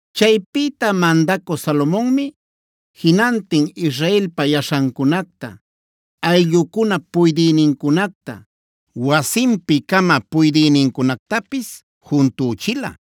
Chaypïta mandacü Salomonmi jinantin Israelpa yaśhancunacta, ayllucunap puydïnincunacta, wasinpi-cama puydïnincunactapis juntüchila,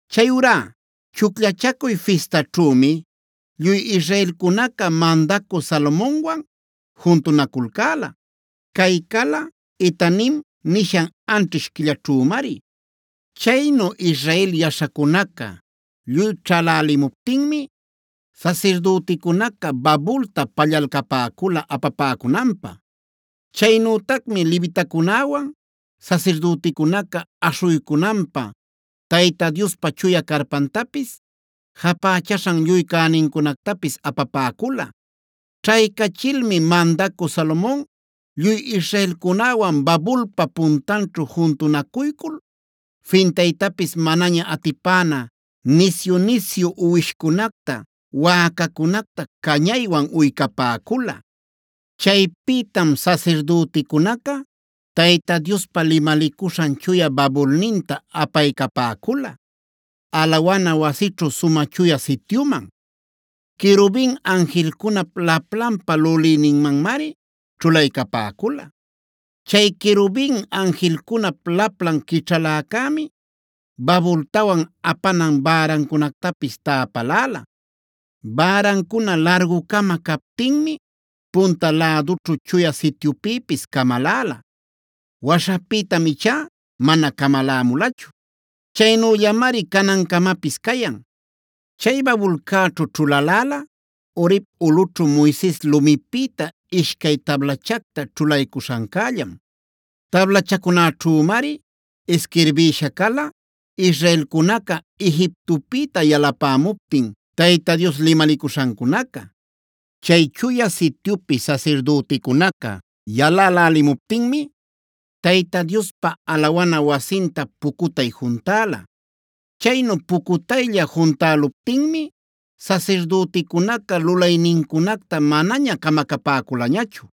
Chayurá Chucllachacuy Fistaćhümi lluy israelcunaca mandacü Salomonwan juntunaculcäla. Cay cala “Etanim” nishan anćhish quillaćhümari. Chaynu Israel yaśhacunaca lluy ćhälälimuptinmi sasirdüticunaca babulta pallalcapäcula apapäcunanpä. Chaynütacmi levitacunäwan sasirdüticunaca aśhuycunapä Tayta Diospa chuya carpantapis, japächaśhan lluy cänincunactapis apapäcula. Ćhaycachilmi mandacü Salomon lluy israelcunäwan babulpa puntanćhu juntunacuycul fintaytapis manaña atipäna nisyu-nisyu uwishcunacta, wäcacunacta cañaywan uycapäcula. Chaypïtam sasirdüticunaca Tayta Diospa limalicuśhan chuya babulninta apaycapäcula, alawana wasićhu Sumä Chuya Sityuman. Querubin anjilcunap laplanpa lulïninmanmari ćhulaycapäcula. Chay querubin anjilcunap laplan quićhaläcämi babultawan apanan bärancunactapis täpaläla. Bärancuna largu-cama captinmi punta lädućhu Chuya Sityupïpis camaläla. Waśhapïtam ichá mana camalämulachu; chaynüllamari canancamapis cayan. Chay babulcäćhu ćhulaläla Horeb ulꞌućhu Moises lumipïta ishcay tablachacta ćhulaycuśhancällam.b Tablachacunäćhumari isquirbïsha cala israelcunaca Egiptopïta yalapämuptin Tayta Dios limalicuśhancunaca. Chay Chuya Sityupi sasirdüticunaca yalälälimuptinmi Tayta Diospa alawana wasinta pucutay juntäla. Chaynu pucutaylla juntäluptinmi sasirdüticunaca lulaynincunacta manaña camacapäculañachu.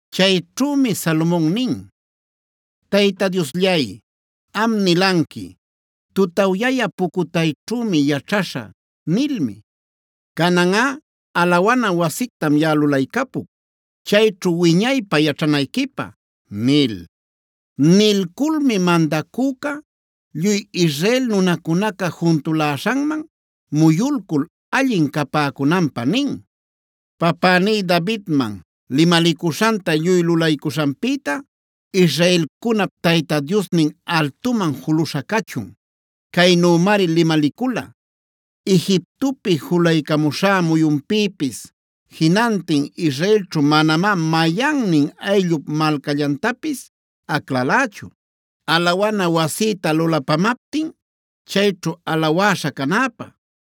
Chayćhümi Salomon nin: “Tayta Diosllay, am nilanqui: ‘Tutawyayä pucutayćhümi’ yaćhaśha nilmi. Cananꞌa alawana wasictam yaꞌa lulaycapuc, chayćhu wiñaypä yaćhanayquipä” nil. Nilculmi mandacüca lluy Israel nunacunaca juntuläśhanman muyulcul allin capäcunanpä nin: “Papäní Davidman limalicuśhanta lluy lulaycuśhanpïta israelcunap Tayta Diosnin altuman juluśha cachun. Caynümari limalicula: ‘Egiptopi julaycamuśhá muyunpïpis jinantin israelćhu manamá mayannin ayllup malcallantapis aclalächu, alawana wasïta lulapamaptin, chayćhu alawäśha canäpä.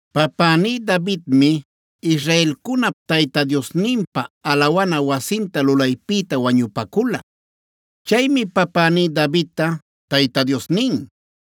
Papäní Davidmi israelcunap Tayta Diosninpä alawana wasinta lulaypïta wañupacula. Chaymi papäní Davidta Tayta Dios nin: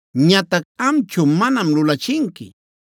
Ñatac amchu manam lulachinqui;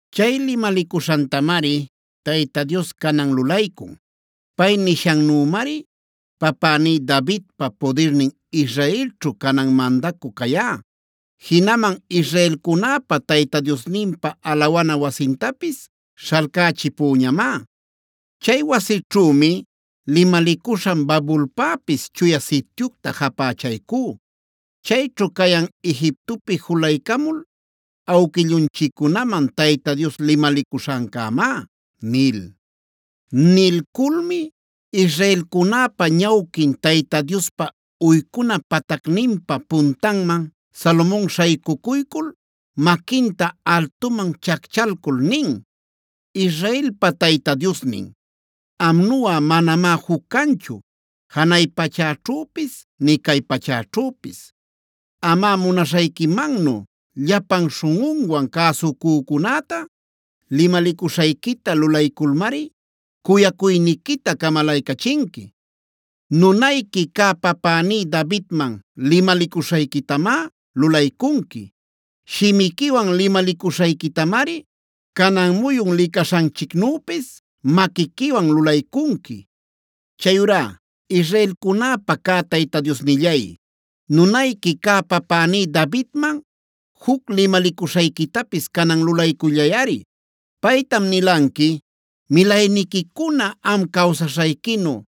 “Chay limalicuśhantamari Tayta Dios canan lulaycun. Pay nishannümari papäní Davidpa pudirnin Israelćhu canan mandacü cayá. Jinaman israelcunäpa Tayta Diosninpa alawana wasintapis śhalcächipüñamá. Chay wasićhümi limalicuśhan babulpäpis Chuya Sityucta japächaycú. Chayćhu cayan Egiptopi julaycamul awquillunchiccunaman Tayta Dios limalicuśhancämá” nil. Nilculmi israelcunäpa ñawquin Tayta Diospa uycuna patacninpa puntanman Salomon śhaycucuycul maquinta altuman chacchalcul nin: “Israelpa Tayta Diosnin, amnuꞌa manamá juc canchu janay pachäćhüpis, nï cay pachäćhüpis. Amꞌa, munaśhayquimannu llapan śhunꞌunwan cäsucücunäta limalicuśhayquita lulayculmari cuyacuyniquita camalaycachinqui. Nunayqui cä papäní Davidman limalicuśhayquitamá lulaycunqui. Shimiquiwan limalicuśhayquitamari canan muyun licaśhanchicnüpis maquiquiwan lulaycunqui. Chayurá israelcunäpa cä Tayta Diosnillay, nunayqui cä papäní Davidman juc limalicuśhayquitapis canan lulaycullayꞌari. Paytam nilanqui: ‘Milayniquicuna am cawsaśhayquinu,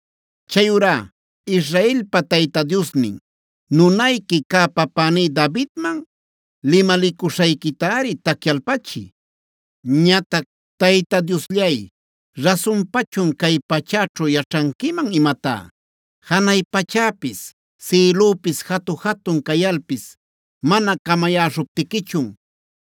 Chayurá Israelpa Tayta Diosnin nunayqui cä papäní Davidman limalicuśhayquitari tacyalpachiy. “Ñatac ¿Tayta Diosllay, rasunpachun cay pachäćhu yaćhanquiman imatá? Janay pachäpis, sïlüpis jatu-jatun cayalpis mana camayäśhuptiquichun,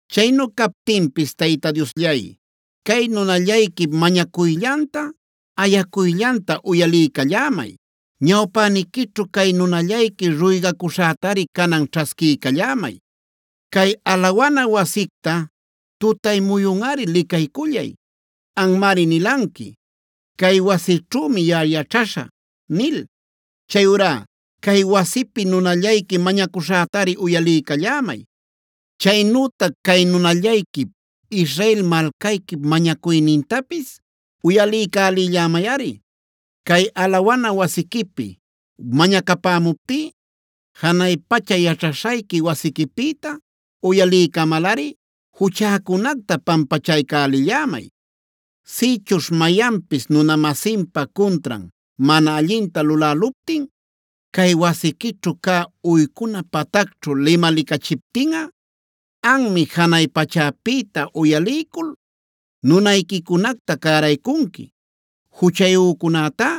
Chaynu captinpis Tayta Diosllay, cay nunallayquip mañacuyllanta, ayacuyllanta uyaliycallämay. Ñawpäniquićhu cay nunallayqui ruygacuśhätari canan ćhasquiycallämay. Cay alawana wasicta tutay muyunꞌari licaycullay. Anmari nilanqui: ‘Cay wasićhümi yaꞌa yaćhaśhä’ nil.i Chayurá cay wasipi nunallayqui mañacuśhätari uyaliycallämay. Chaynütac cay nunallayquip, Israel malcayquip mañacuynintapis uyaliycälillämayꞌari. Cay alawana wasiquipi mañacapämuptí janay pacha yaćhaśhayqui wasiquipïta uyaliycamalꞌari juchäcunacta pampachaycälillämay. “Sïchuśh mayanpis nuna-masinpa cuntran mana allinta luläluptin cay wasiquićhu cä uycuna patacćhu limalicachiptinꞌa, anmi janay pachäpïta uyaliycul nunayquicunacta cäraycunqui. Juchayücunätá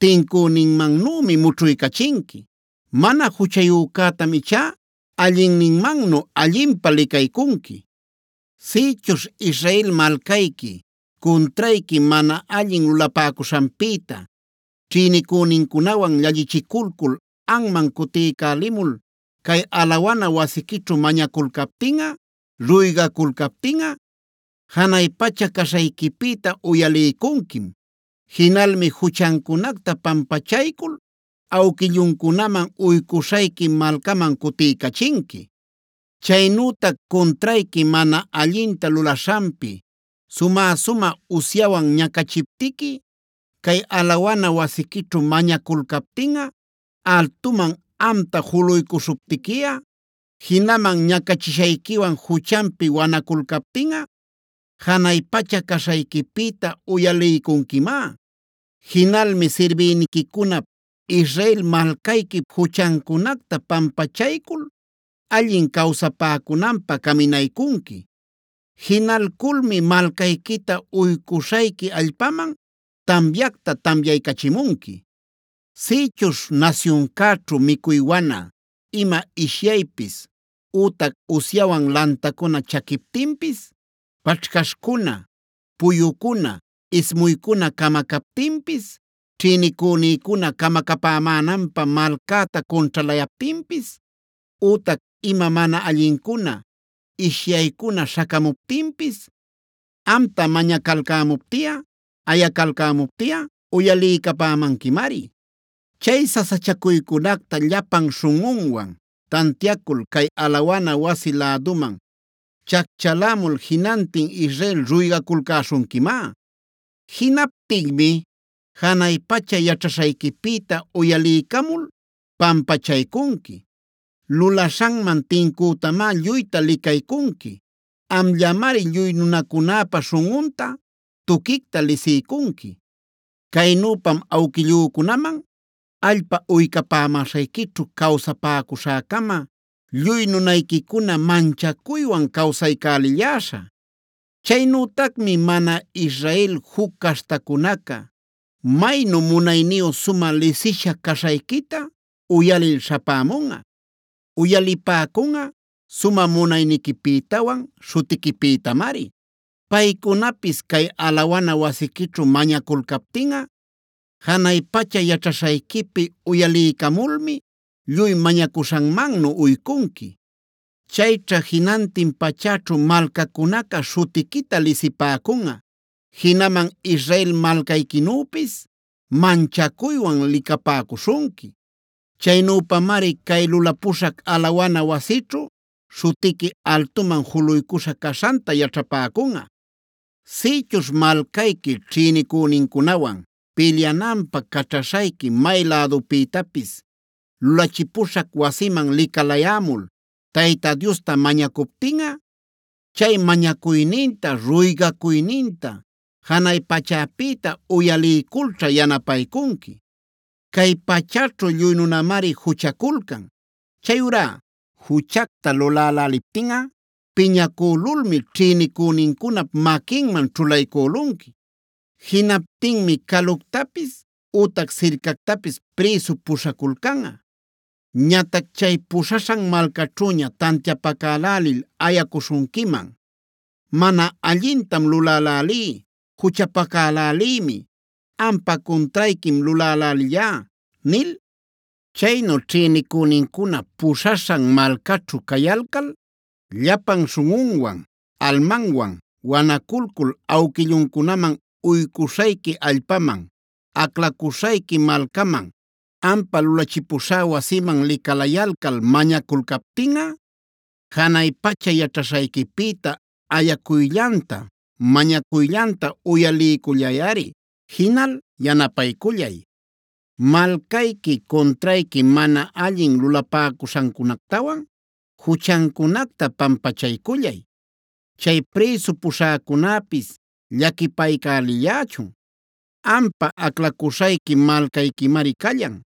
tincüninmannümi mućhuycachinqui. Mana juchayücätam ichá allinninmannu allinpä licaycunqui. “Sïchuśh Israel malcayqui cuntrayqui mana allin lulapäcuśhanpïta ćhïnicünincunawan llallichiculcul anman cutiycälimul cay alawana wasiquićhu mañaculcaptinꞌa, ruygaculcaptinꞌa, janay pacha caśhayquipïta uyaliycunquim. Jinalmi juchancunacta pampachaycul awquilluncunaman uycuśhayqui malcaman cutiycachinqui. “Chaynütac cuntrayqui mana allinta lulaśhanpi sumä-sumä usyawan ñacachiptiqui cay alawana wasiquićhu mañaculcaptinꞌa, altuman amta juluycuśhuptiquiꞌa, jinaman ñacachishayquiwan juchanpi wanaculcaptinꞌa, janay pacha caśhayquipïta uyaliycunquimá. Jinalmi sirbïniquicunap, Israel malcayquip juchancunacta pampachaycul allin cawsapäcunanpä caminaycunqui. Jinalculmi malcayquita uycuśhayqui allpaman tamyacta tamyaycachimunqui. “Sïchuśh nasyuncäćhu micuy wana, ima ishyaypis, ütac usyawan lantacuna chaquiptinpis, paćhcaśhcuna, puyucuna, ismuycuna camacaptinpis, ćhïnicünïcuna camacapämänanpä malcäta cunćhalayaptinpis, ütac ima mana allincuna, ishyaycuna śhacamuptinpis, amta mañacalcämuptiꞌa, ayacalcämuptiꞌa uyaliycapämanquimari. Chay sasachacuycunacta llapan śhunꞌunwan tantiacul cay alawana wasi läduman chacchalämul jinantin Israel ruygaculcäśhunquimá. Jinaptinmi janay pacha yaćhaśhayquipïta uyaliycamul pampachaycunqui. Lulaśhanman tincütamá lluyta licaycunqui. Amllamari lluy nunacunäpa śhunꞌunta tuquicta lisiycunqui. Caynüpam awquillücunaman allpa uycapämäśhayquićhu cawsapäcuśhä-cama lluy nunayquicuna manchacuywan cawsaycälilläśhä. “Chaynütacmi mana Israel juc caśhtacunaca maynu munayniyu sumä lisisha caśhayquita uyalil śhapämunꞌa. (Uyalipäcunꞌa sumä munayniquipïtawan śhutiquipïtamari.) Paycunapis cay alawana wasiquićhu mañaculcaptinꞌa, janay pacha yaćhaśhayquipi uyaliycamulmi lluy mañacuśhanmannu uycunqui. Chayćha jinantin pachäćhu malcacunaca śhutiquita lisipäcunꞌa. Jinaman Israel malcayquinüpis manchacuywan licapäcuśhunqui. Chaynüpamari cay lulapuśhac alawana wasićhu śhutiqui altuman juluycuśha caśhanta yaćhapäcunꞌa. “Sïchuśh malcayqui ćhïnicünincunawan pilyananpä caćhaśhayqui may lädupïtapis lulachipuśhac Wasiman licalayämul Tayta Diosta mañacuptinꞌa, chay mañacuyninta, ruygacuyninta janay pachäpïta uyaliyculćha yanapaycunqui. “Cay pachäćhu lluy nunamari juchaculcan. Chayurá juchacta luläläliptinꞌa piñacülulmi ćhïnicünincunap maquinman ćhulaycülunqui. Jinaptinmi caluctapis ütac sircactapis prïsu puśhaculcanꞌa. Ñatac chay puśhaśhan malcaćhüña tantiapacälälil ayacuśhunquiman: ‘Mana allintam lulälälí, juchapacalälïmi, ampa cuntrayquim lulälälillá’ nil. Chaynu ćhïnicünincuna puśhaśhan malcaćhu cayalcal llapan śhunꞌunwan, almanwan wanaculcul awquilluncunaman uycuśhayqui allpaman, aclacuśhayqui malcaman, ampä lulachipuśhá wasiman licalayalcal mañaculcaptinꞌa, janay pacha yaćhaśhayquipïta ayacuyllanta, mañacuyllanta uyaliycullayꞌari. Jinal yanapaycullay. Malcayqui cuntrayqui mana allin lulapäcuśhancunactawan juchancunacta pampachaycullay. Chay prïsu puśhäcunäpis llaquipaycälillächun. Ampa aclacuśhayqui malcayquimari callan.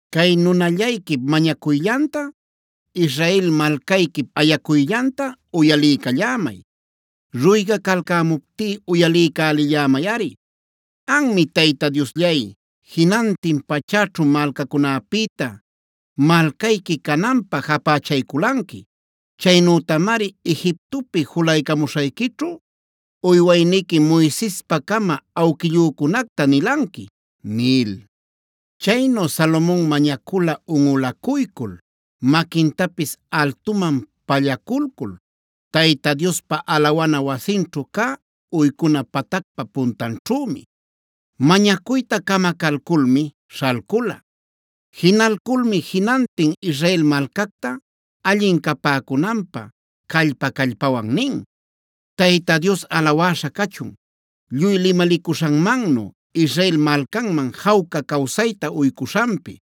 “Cay nunallayquip mañacuyllanta, Israel malcayquip ayacuyllanta uyaliycallämay. Ruygacalcämuptí uyaliycälillämayꞌari. Anmi Tayta Diosllay, jinantin pachäćhu malcacunäpïta malcayqui cananpä japächayculanqui. Chaynütamari Egiptopi julaycamuśhayquićhu uywayniqui Moisespacama awquillücunacta nilanqui” nil. Chaynu Salomon mañacula unꞌulacuycul, maquintapis altuman pallaculcul Tayta Diospa alawana wasinćhu cä uycuna patacpa puntanćhümi. Mañacuyta camacalculmi śhalcula. Jinalculmi jinantin Israel malcacta allin capäcunanpä callpa-callpawan nin: “Tayta Dios alawäśha cachun, lluy limalicuśhanmannu Israel malcanman jawca cawsayta uycuśhanpi.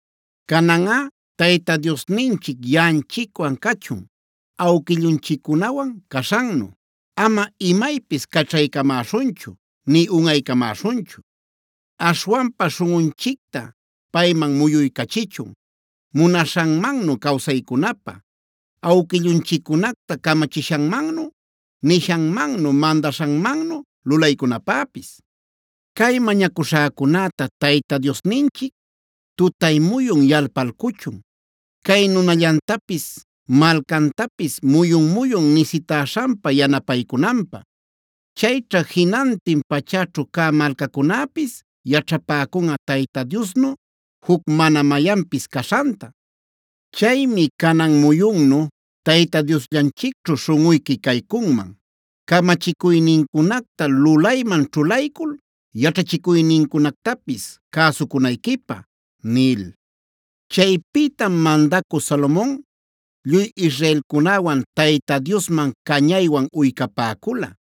“Cananꞌa Tayta Diosninchic yaꞌanchicwan cachun awquillunchiccunawan caśhannu. Ama imaypis caćhaycamäśhunchu nï unꞌaycamäśhunchu. Aśhwanpa śhunꞌunchicta payman muyuycachichun munaśhanmannu cawsaycunapä, awquillunchiccunacta camachishanmannu, nishanmannu, mandaśhanmannu lulaycunapäpis. Cay mañacuśhäcunäta Tayta Diosninchic tutay muyun yalpalcuchun, cay nunallantapis, malcantapis muyun-muyun nisitäśhanpa yanapaycunanpä. Chayćha jinantin pachäćhu cä malcacunäpis yaćhapäcunꞌa Tayta Diosnu juc mana mayanpis caśhanta. Chaymi canan muyunnu Tayta Diosllanchicćhu śhunꞌuyqui caycunman, camachicuynincunacta lulayman ćhulaycul yaćhachicuynincunactapis cäsucunayquipä” nil. Chaypïtam mandacü Salomon lluy israelcunäwan Tayta Diosman cañaywan uycapäcula.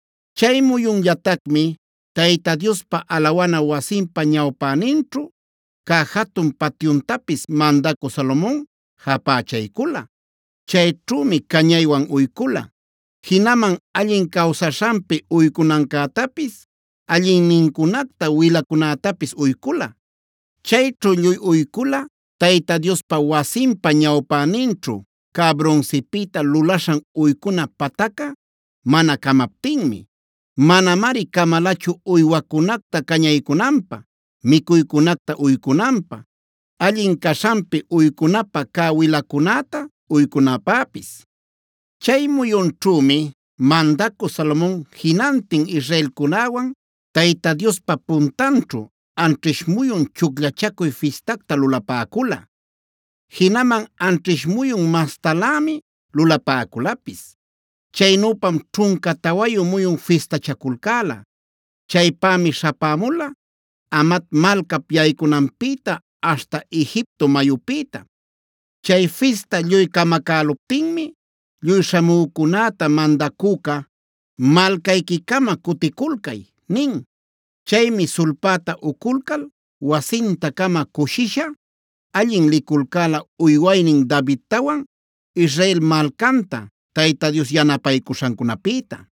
Chay muyunllatacmi Tayta Diospa alawana wasinpa ñawpäninćhu cä jatun patyuntapis mandacü Salomon japächaycula. Chayćhümi cañaywan uycula. Jinaman allin cawsaśhanpi uycunancätapis allinnincunacta wilacunätapis uycula. Chayćhu lluy uycula Tayta Diospa wasinpa ñawpäninćhu cä brunsipïta lulaśhan uycuna patacca mana camaptinmi. Manamari camalachu uywacunacta cañaycunanpä, micuycunacta uycunanpä, allin caśhanpi uycunapa cä wilacunäta uycunapäpis. Chay muyunćhümi mandacü Salomon jinantin israelcunäwan Tayta Diospa puntanćhu anćhish muyun Chucllachacuy Fistacta lulapäcula. Jinaman anćhish muyun mastalämi lulapäculapis. Chaynüpam ćhunca tawayu muyun fistachaculcäla. Chaypämi śhapämula Hamat malcap yaycunanpïta aśhta Egipto mayüpïta. Chay fista lluy camacäluptinmi lluy śhamücunäta mandacüca: “Malcayquiman-cama cuticulcay” nin. Chaymi sulpäta uculcal wasinta-cama cushisha, allin liculcäla uywaynin Davidtawan, Israel malcanta Tayta Dios yanapaycuśhancunapïta.